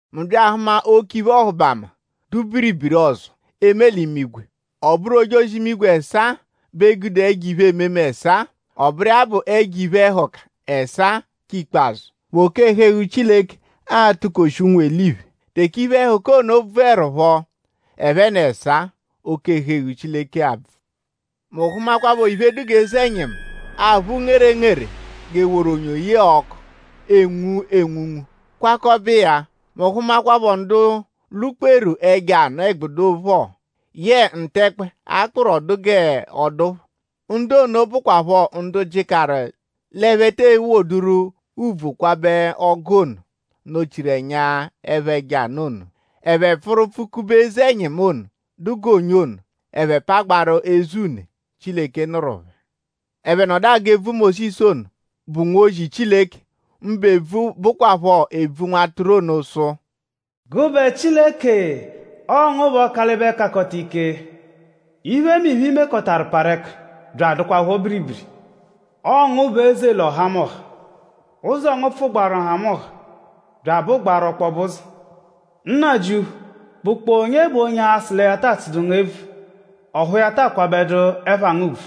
Mu bya ahụma oke iphe-ọhubama, dụ biribiri ọzo, eme l'imigwe. Ọ bụru ojozi-imigwe ẹsaa bẹ gude ẹjo iphe-ememe ẹsaa. Ọ bụru iya bụ ẹjo iphe-ẹhuka ẹsaa k'ikpazụ, bụ oke-ẹhu-eghu Chileke a-tụkoshi ụnwu-eliphe. Teke iphe-ẹhuka ono bvụerupho ẹphe n'ẹsaa; oke-ẹhu-eghu Chileke abvụ. Mu hụmakwapho iphe, dụ g'eze-ẹnyimu, aphụ ngerengere g'e woru onyo yẹe ọku, enwu enwunwu gwakọbe iya. Mu hụmakwapho ndu lwụ-kperu ẹjo anụ-ẹgbudu phọ yẹe ntẹkpe, a kpụru ọ dụ g'ọ dụ phọ. Ndu ono bụkwapho ndu jịkaru l'ẹphe te ewoduru ùbvù akwabẹ ọ́gú ono, nọ-chiru ẹnya ẹpha ẹjo anụ ono. Ẹphe pfụru pfụ-kube eze-ẹnyimu ono, dụ g'onyo ono. Ẹphe pagbaarụ eze une, Chileke nụru phẹ. Ẹphe nọdu agụ ebvu Mósisu ono, bụ nwozi Chileke; mbụ ebvu, bụkwapho ebvu Nwatụru ono sụ: “Gụbe Chileke; ọo ngu bụ Ọkalibe-Kakọta-Ike. Iphemiphe, i mekọtaru parụ ẹka bya adụkwapho biribiri. Ọo ngu bụ eze l'ọhamoha. Ụzo ngu pfụgbaaru nhamụnha bya abụgbaaru ọkpobe ụzo. Nnajịuphu;?bụkpoo onye bụ onye a-sụ lẹ ya taa tsụdu ngu ebvu; ọphu ya taa akwabẹdu ẹpha ngu ùbvù?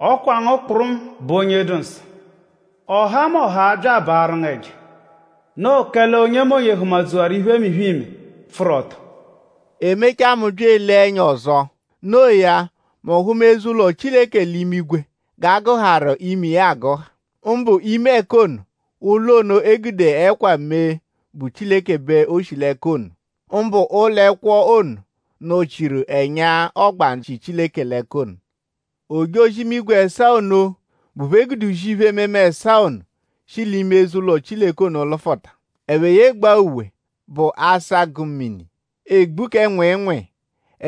Ọ kwa ngu kpụrumu bụ onye dụ nsọ. Ọhamoha a-bya abaarụ ngu ẹja. Noo kẹle onyemonye hụma-dzuwaru iphemiphe, iime, pfụru ọto.” E mechaa; mu bya elee ẹnya ọzo. No iya; mu hụma eze-ụlo Chileke l'imigwe g'a gụharu ime iya agụha. Mbụ ime ẹka ono, ụlo ono, e gude ẹkwa mee bụ Chileke bẹ o shi l'ẹka ono nọ; mbụ ụlo ẹkwo ono, nọ-chiru ẹnya ọgbandzu, shi Chileke l'ẹka ono. Ojozi-imigwe ẹsaa ono, bụ phẹ gude uzi ẹjo iphe-ememe ẹsaa ono shi l'ime eze-ụlo Chileke ono lụfuta. Ẹphe yegbaa uwe, bụ asagụ-mini; egbu kẹ nwịinwii.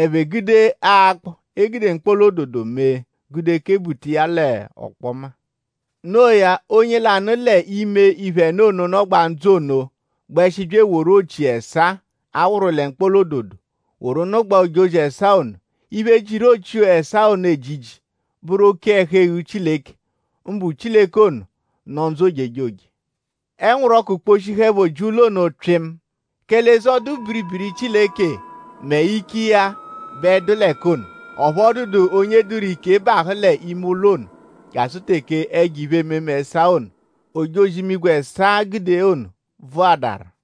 Ẹphe gude akpọ, e gude mkpọla-ododo mee; gude kebuta iya l'ọkpoma. No iya; onye lanụ l'ime iphe ẹno ono, nọgbaa ndzụ ono gbẹshi bya eworu ochi ẹsaa, a wụru lẹ mkpọla-ododo; woru nụgbaa ojozi ẹsaa ono. Iphe, jiru ochi ẹsaa ono ejiji bụru oke-ẹhu-eghu Chileke; mbụ Chileke ono, nọ ndzụ ojejoje. Ẹnwuru ọku kposhihụepho ji ụlo ono pyịmu; kẹle eze-ọdu-biribiri Chileke mẹ ike iya bẹ dụ l'ẹka ono. Ọphu ọ dụdu onye dụru ike bahụ l'ime ụlo ono jasụ teke ẹjo iphe-ememe ẹsaa ono, ojozi-imigwe ẹsaa gude ono bvụadaru.